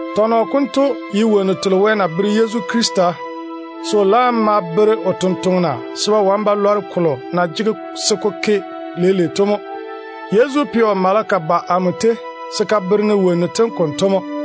Tɔnɔ konto wo wonnu tem ye kolo Wɛ na bere Yezu Krista se o ma le o bere o tontoŋena, se ba wane ba lɔre kolo na jege se ko ke leile to mo. Yezu pɛ o maleka mo ba amo tei se ka bere-ne wonnu tem konto.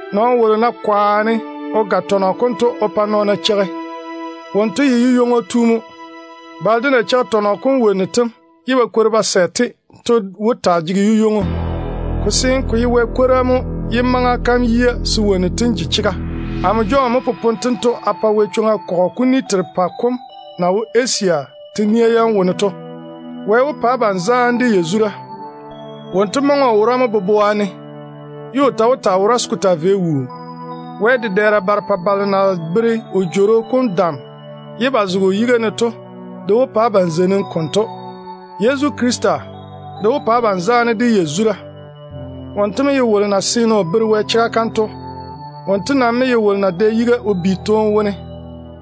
Nɔɔno wolo ná kwaane o ga tɔnɔ konto pa nɔɔna cheigi, wonto ye yu-ywoŋo tu mo. Balo de na cheigi tɔnɔ kom wo wonnu tem ye ba kwori ba sɛ-te de ba wo maama to wó taa jege yu-ywoŋo. Ko seene ko ye kolo Wɛ na le o bere-ne to mo, ye maŋa kam yia se wonnu tem seene te ke. Amo Jɔn mo popone tento a pa Yezu kɔgɔ kuni berepɛ kolo na wo Asia te-nia yam wone to. Wɛ wó pa abam zaane de yazura. Wonto maŋe o wora mo boboa ne, ye o ta wora zem se ko taa vei wuu. Wɛ dedɛɛra barepɛ balo na bere o Jworo kom dam ye ba zege o paare yitiŋu kom yiga ne to de wó pa abam zeinim konto. Yezu Krista de wó pa abam zaane de yazura. Wonto mo ye wolo na yɔɔre o zege Wɛ chega kam kwaga ne to. Wonto ta mo ye wolo na dɛ yiga o bi toone wone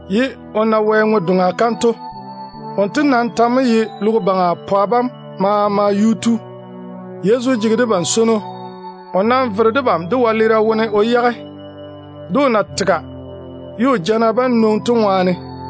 ye o na Wɛ ŋwe-doŋa kam to. O nam ta mo ye logo baŋa pwa bam maama yuu tu. Yezu swoi debam ye o vere debam dé wɛleera wone o yage, o na tega ye o jana bam nwoŋi to ŋwaane.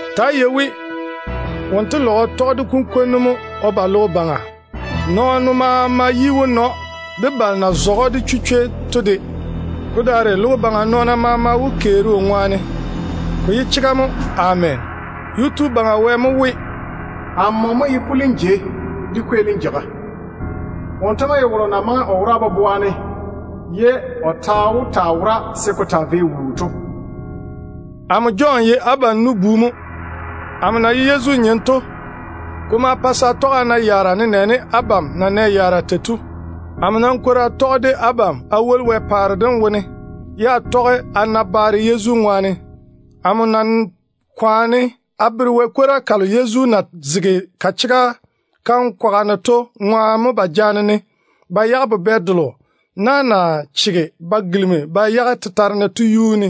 Nii-na! Wonto tɔge de kunkwonnu mo o beene. Nɔɔno maama yi wó na‑o, de balo na zɔge‑o de chichwei to de. Ko daare logo baŋa dwi maama wó keeri o ŋwaane. Ko ye chega mo. Ameena. Yuu-tu Baŋa Wɛ mo we: “Amo mo ye pulim jei de kweelim jeiga.” Wonto mo maŋe o wora boboa ne, ye o ta wora zem se ko taa vei wuu. Amo Jɔn ye abam nu-bu mo. Amo na ye Yezu nyem to, ko ma pa se a tɔge a na yaara nenɛɛne abam de na nɛ yaara tei to. Amo nam kwori a tɔge de abam a woli Wɛ paare dem wone, ye a tɔge a na baare Yezu ŋwaane. Amo na kwaane a bere Wɛ kwora kalo Yezu na le o bere-ne to ŋwaane mo ba jaane-ne ba yage Patama buburu kom yuu ne. Patama ye buburu kolo na na chege ba gilimi ba yage tetare ne to.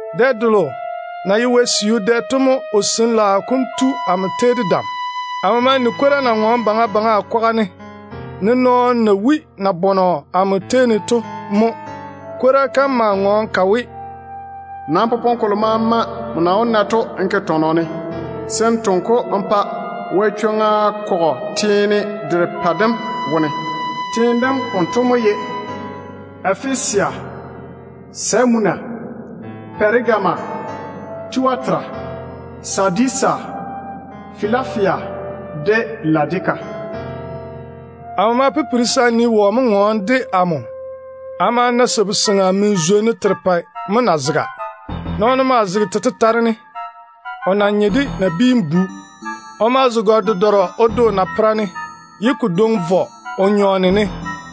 Dɛ delo na ye Wɛ siu dɛ to mo o Sin-laao kom tu amo tei de dam. Amo ma ni kwora na ŋɔɔne baŋa baŋa a kwaga ne, ne nɔɔno na wui nabɔnɔ tei to. Kwora kam ma ŋɔɔne ka we, “Nam popone kolo maama nmo na wó na to n ke tɔnɔ ne, se n toŋe-ko n pa Yezu kɔgɔ kolo na wo teene derepɛ dem wone to. Teene dem konto mo ye: Efesia, Semuna, Pɛregama, Tuatera, Sadisa, Filafia, de Ladika.” Amo ma pipiri se a nii wɔ mo ŋɔɔna de amo. A ma na sabu-seŋa min-zwonnu terepɛ mo na zega. Nɔɔno maa zege te tetare ne, o na nye de nabiinu bu. O ma zo gare-dedɔrɔ o de o napera ne, ye o daare o vɔ sabu-seŋa kila o nyɔɔne ne.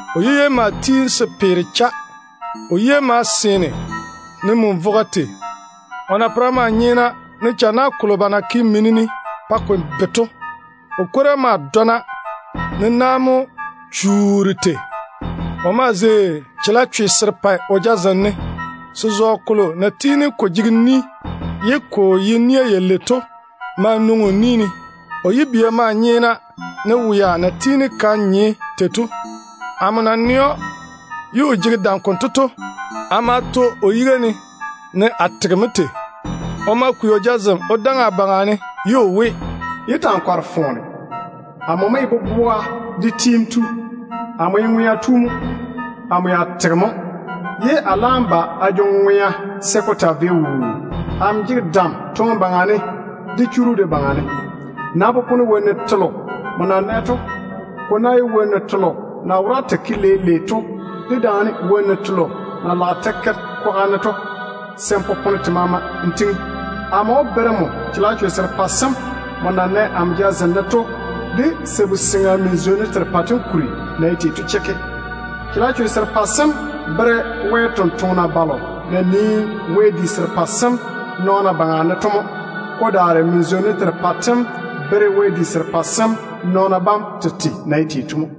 O yu-ywei maa tiini se peere cha, ne lɔŋɔ tei. O yia maa nye ne min-vogo tei. O napera maa nyeena, ne channa kolo ba na ke mini ne pa ko be to. O kwora maa dɔna ne na-fwaaro mo chuuri tei. O maa zei chalechwe serepɛ o jazem ne. Se-zɔɔ kolo na tiini ko jege ni ye ko ye nia yalei to maa nwoŋi o ni ne. O yibia maa nyeena, ne wea na tiini ka nye tei to. Amo na nɛ‑o ye o jege dam konto to, a ma to o yiga ne, ne a tega mo tei. O ma kwei o jazem o daŋe a baŋa ne, ye o we: “Yé ta‑n kɔre foone. Amo mo ye boboa kam de gurim tu. Amo ye ŋwea tu mo. Amo ya tege mo, ye a laam jwoori a jege ŋwea se ko taa vei wuu. Amo jege dam toone baŋa ne de churu de baŋa ne. Nam popone wonnu telo nmo na nɛ to. Ko ná ye wonnu telo na wora te ke leile to, dedaane wonnu telo na lage te ke kwaga to, se n popone te maama n tiŋi. Amo wó bere‑m chalechwe serepɛ sem nmo na nɛ amo jazem ne to, de sabu-seŋa min-zwonnu terepɛ tem kuri na ye tei to chekke. Chalechwe serepɛ sem bere Wɛ tontoŋena balo na nii wɛ-di serepɛ sem nɔɔna baŋa ne to mo. Ko daare min-zwonnu terepɛ tem de bere wɛ-di serepɛ sem nɔɔna bam tete na ye tei to mo.”